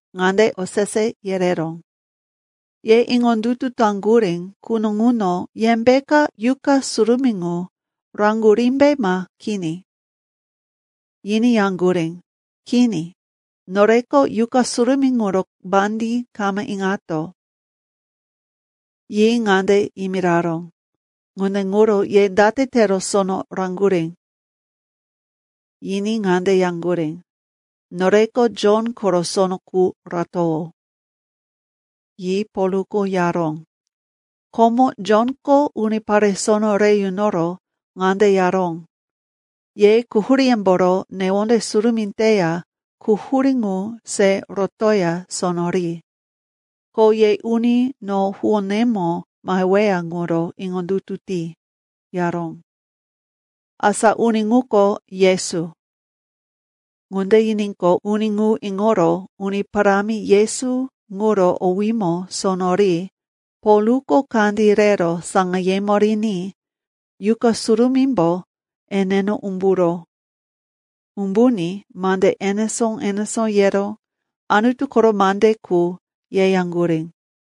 ŋande osese yereró, “Ye iŋondutu taŋgurí quno ŋuno yembeka Yuqa Surumí ŋu raŋgurímbe ma kini?” Yiní yaŋgurí, “Kini. Noreko Yuqa Surumí ŋuro mandí kama iŋato.” Yi ŋande yimiraró, “Ŋunde ŋuro ye date tero sono raŋgurí?” Yiní ŋande yaŋgurí, “Noreko Jon koro sono qu ratowó.” Yi Polko yaró, “Komo Jonko unipare sono re yunoro ŋande yaró, ‘Ye quhuríyemboro newonde surumí teya quhurí ŋu se rotoya sono ri. Ko ye uni no huwónemo maheweya ŋuro iŋondutu ti,’ yaró. Asa uni ŋuko Yesu.” Ŋunde yiníqo, uni ŋu iŋoro Uni Parámi Yesu ŋuro owímo sono ri Polko kandí rero saŋayemo riní Yuqa Surumímbo eneno umburó. Umbuní mande enesó-enesó yero Anutu koro mande qu yeyaŋgurí.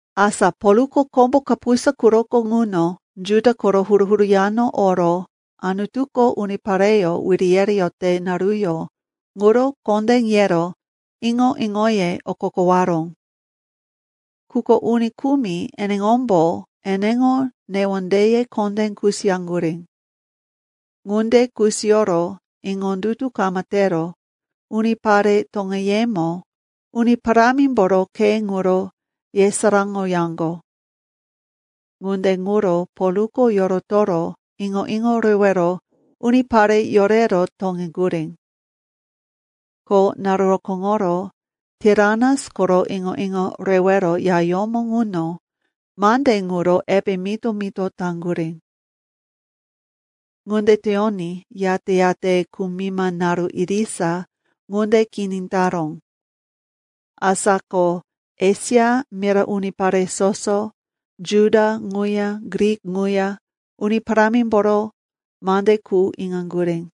Asa Polko kombo kapusa quroko ŋuno Juda koro huru-huru yano oro Anutuko unipareyó wiri yereyote naruyó ŋuro kondé yero iŋo-iŋoye okokowaró. Quko uni kumi eneŋombo eneŋo newondeye kondé kusiyaŋgurí. Ŋunde kusiyoro iŋondutu kama tero unipare toŋeyemo Uni Parámimboro khe ŋuro yesaráŋoyaŋgo. Ŋunde ŋuro Polko yorotoro iŋo-iŋo rewero unipare yorero toŋeŋgurí. Ko naru rokóŋoro Tiranas koro iŋo-iŋo rewero yayómo ŋuno mande ŋuro epe mito-mito taŋgurí. Ŋunde teyoní, yate-yate kumima naru irisa ŋunde kini taró. Asa ko Esia mira unipare soso, Juda ŋuya Grik ŋuya, Uni Parámimboro mande qu iŋaŋgurí.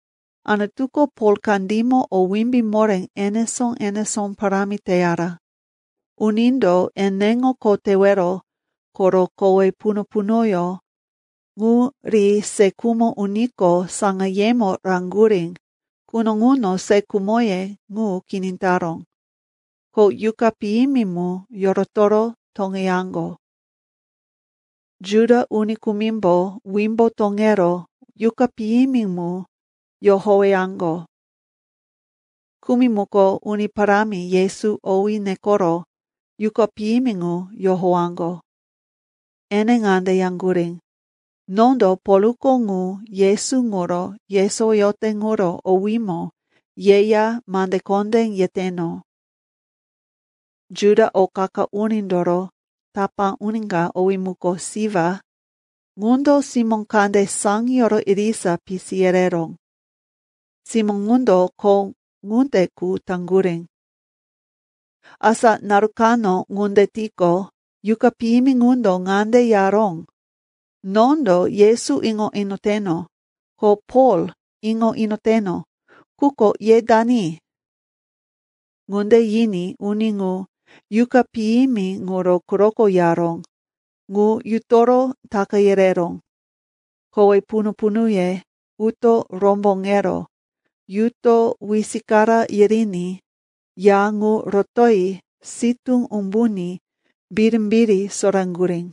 Anutuko Pol kandímo o wimbí moré enesó-enesó parámi teyara. Unindo eneŋo kho tewero koro kowe punu-punuyó ŋu ri se khumo uniko saŋayemo raŋgurí quno ŋuno se khumoye ŋu kini taró, ko yuqa piyimi mu yorotoro toŋeyaŋgo. Juda uni kumimbo wimbo toŋero yuqa piyimi mu yohoweyaŋgo. Kumi muko Uni Parámi Yesu owí nekoro yuqa piyimi ŋu yohowaŋgo. Ene ŋande yaŋgurí, “Nondo Polko ŋu Yesu ŋuro yesowoyote ŋuro owímo yeya mande kondé yeteno.” Juda o qa-qa unindoro tapá uni ka, owí muko Siva, ŋundo simó kande saŋiyoro irisa pisi yereró. Simó ŋundo kho ŋunde qu taŋgurí. Asa naru kano ŋunde tiqo, yuqa piyimi ŋundo ŋande yaró, “Nondo Yesu iŋo inoteno, ko Pol iŋo inoteno. Quko ye dani?” Ŋunde yiní uni ŋu, yuqa piyimi ŋuro quroko yaró, ŋu yutoro taka yereró. Kowe punu-punuye uto romboŋero yuto wisikara yiriní ya ŋu rotoyi sitú umbuní birimbiri soraŋgurí.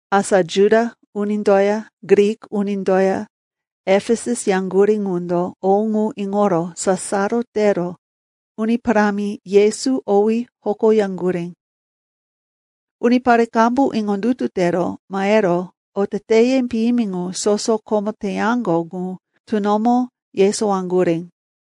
Asa Juda unindoya Grik unindoya Efesus yaŋgurí ŋundo o ŋu iŋoro sasaro tero Uni Parámi Yesu owí hokoyaŋgurí. Unipare qambu iŋondutu tero mahero oteteye piyimi ŋu soso komo teyaŋgo ŋu tunomo yesowaŋgurí.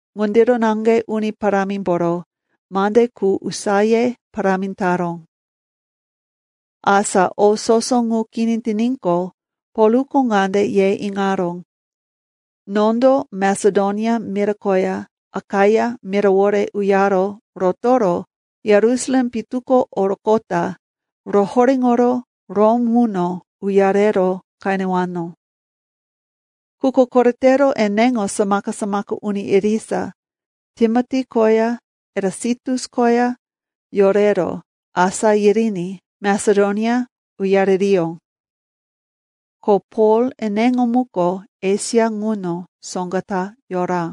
Ŋundiro naŋge Uni Parámimboro mande qu usaye parámi taró. Asa o soso ŋu kini tiníqo, Polko ŋande ye iŋaró, “Nondo Masedonia mira koya Akaia mirawore uyaro rotoro Yerusalem pitu ko oroqota rohoréŋoro Rom ŋuno uyarero qenewano.” Quko koretero eneŋo samaka-samaka uni irisa, Timoti koya Erasitus koya, yorero asá yiriní Masedonia uyaririyó. Ko Pol eneŋo muko Esia ŋuno soŋga ta yora.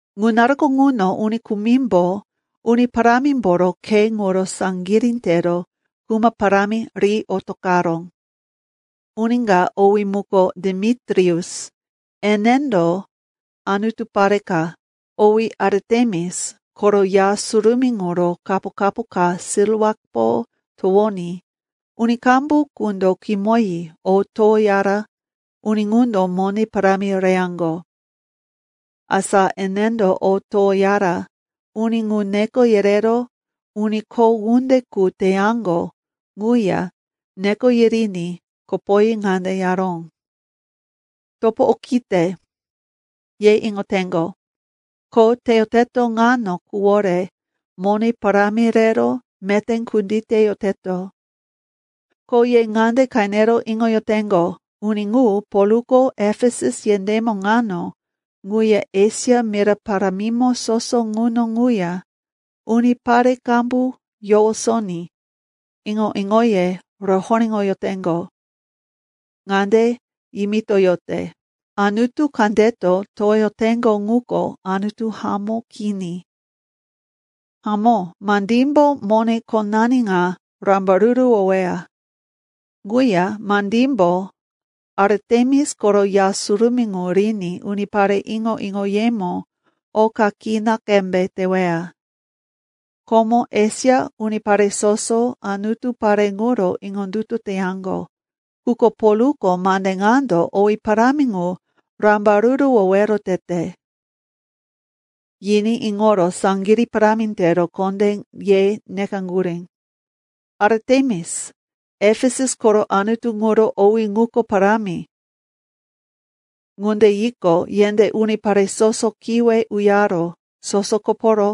Ŋu naruko ŋuno uni kumimbo Uni Parámimboro Khe ŋuro saŋgirí tero kuma parámi ri otoqaró. Uni ka, owí muko Demitrius, enendo anutu pare ka, owí Aritemis, koro ya surumí ŋuro kapo-kapo ka silwapo towoní uni qambu qundo kimoyi o towoyara uni ŋundo mone parámi reyaŋgo. Asa enendo o towoyara uni ŋu neko yerero uni kho ŋunde qu teyaŋgo ŋuya neko yiriní kopoyi ŋande yaró, “Topo okite, ye iŋoteŋgo, kho teyoteto ŋano quwore mone parámi rero meté kunditeyoteto. Ko ye ŋande qenero iŋoyoteŋgo, uni ŋu, Polko Efesus yendémo ŋano ŋuya Esia mira parámimo soso ŋuno ŋuya unipare qambu yowosoní iŋo-iŋoye rohoréŋoyoteŋgo. Ŋande yimitoyote, ‘Anutu kandeto towoyoteŋgo ŋuko anutu hamó kini.’ Hamó, mandímbo mone khonani ŋa rambaruruwoweya. Ŋuya, mandímbo Aritemis koro ya surumí ŋu riní unipare iŋo-iŋoyemo oka kina qembe teweya. Komo Esia unipare soso anutu pare ŋuro iŋondutu teyaŋgo. Quko Polko mande ŋando owí parámi ŋu rambaruruwowero tete.” Yiní iŋoro saŋgirí parámi tero kondé ye nekaŋgurí, “Aritemis, Efesus koro anutu ŋuro owí ŋuko parámi!” Ŋunde yiqo, yendé unipare soso kiwe uyaro soso koporo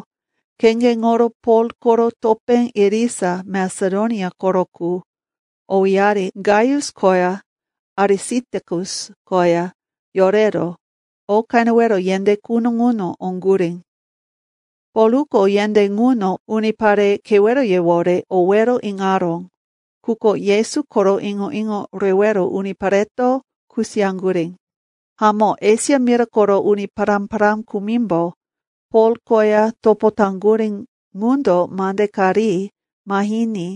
kheŋgeŋoro Pol koro topé irisa Masedonia koro qu, owéyari Gaius koya Arisitakus koya yorero o qenewero yendé quno ŋuno oŋgurí. Polko yendé ŋuno unipare keweroyewore owero iŋaró, quko Yesu koro iŋo-iŋo rewero unipareto kusiyaŋgurí. Hamó, Esia mira koro uni pará-pará kumimbo Pol koya topo taŋgurí ŋundo mande ka ri mahiní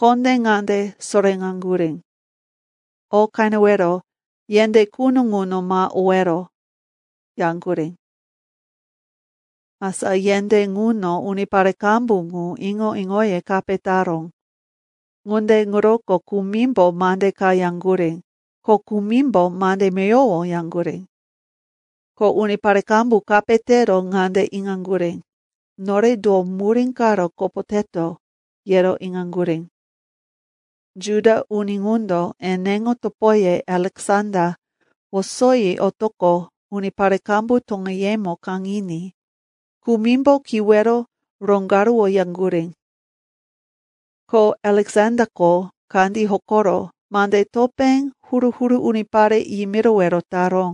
kondé ŋande soréŋaŋgurí, “O qenewero yendé quno ŋuno ma owero,” yaŋgurí. Asa yendé ŋuno unipare qambu ŋu, iŋo-iŋoye kape taró. Ŋunde ŋuroko kumimbo mande ka yaŋgurí, ko kumimbo mande meyowo yaŋgurí. Ko unipare qambu kape tero ŋande iŋaŋgurí, nore do murí karo kopoteto, yero iŋaŋgurí. Juda uni ŋundo eneŋo topoye Aleksanda wosoyi otoqo unipare qambu toŋeyemo kaŋiní kumimbo kiwero roŋgaruwoyaŋgurí. Ko Aleksandako kandí hokoro mande topé huru-huru unipare yimirowero taró.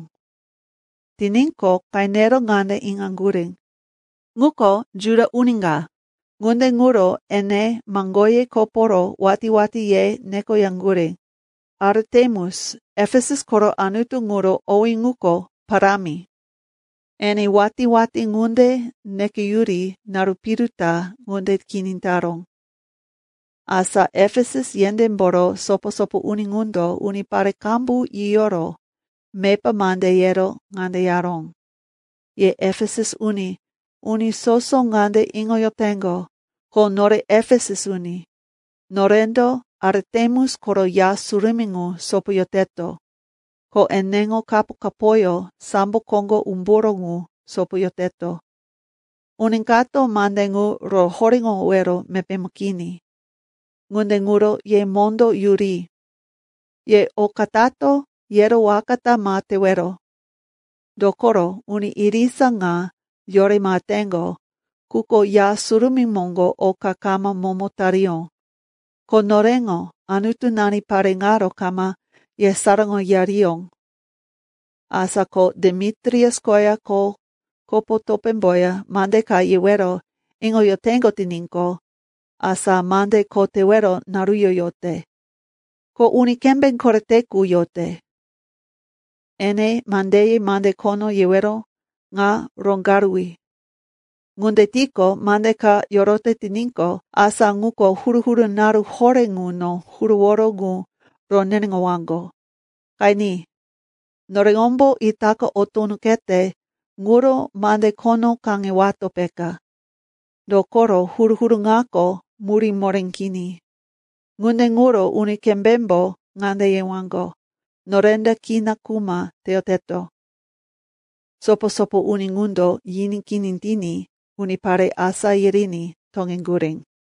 Tiníqo, qenero ŋande iŋaŋgurí, ŋuko Juda uni ka. Ŋunde ŋuro ene maŋgoye koporo watí-watí ye nekoyaŋgurí, “Aritemis, Efesus koro anutu ŋuro owí ŋuko parámi!” Ene watí-watí ŋunde nekeyuri naru piru ta ŋunde kini taró. Asa Efesus yendémboro sopo-sopo uni ŋundo unipare qambu yiyoro mepa mande yero ŋande yaró, “Ye Efesus uni, uni soso ŋande iŋoyoteŋgo, ko nore Efesus uni, norendo Aritemis koro ya surumí ŋu sopoyoteto, ko eneŋo kapo-kapoyó sambo koŋgo umburó ŋu sopoyoteto. Uni kato mande ŋu rohoréŋowero mepémo kini. Ŋunde ŋuro ye mondó yuri. Ye, oka tato, yero waka ta ma tewero. Dokoro uni irisa ŋa yore maheteŋgo, quko ya surumí moŋgo oka kama momo tariyó, ko noreŋo anutunani pare ŋaro kama yesaráŋoyariyó. Asa ko Demitrius koya kho kopo topémboya mande ka yewero iŋoyoteŋgo tiníqo, asa mande kho tewero naruyó yote, ko uni kembé korete qu yote. Ene mandeye mande khono yewero ŋa roŋgaruwi. Ŋunde tiqo, mande ka yorote tiníqo, asa ŋuko huru-huru naru horé ŋuno huruworo ŋu roneneŋowaŋgo. Qeni, noreŋombo itaka o tunoqete ŋuro mande khono kaŋewato, peka. Dokoro huru-huru ŋako murí moré kini. Ŋunde ŋuro uni kembémbo ŋande yewaŋgo, norendo kina kuma teyoteto.” Sopo-sopo uni ŋundo yiní kini tiní, unipare asá yiriní toŋeŋgurí.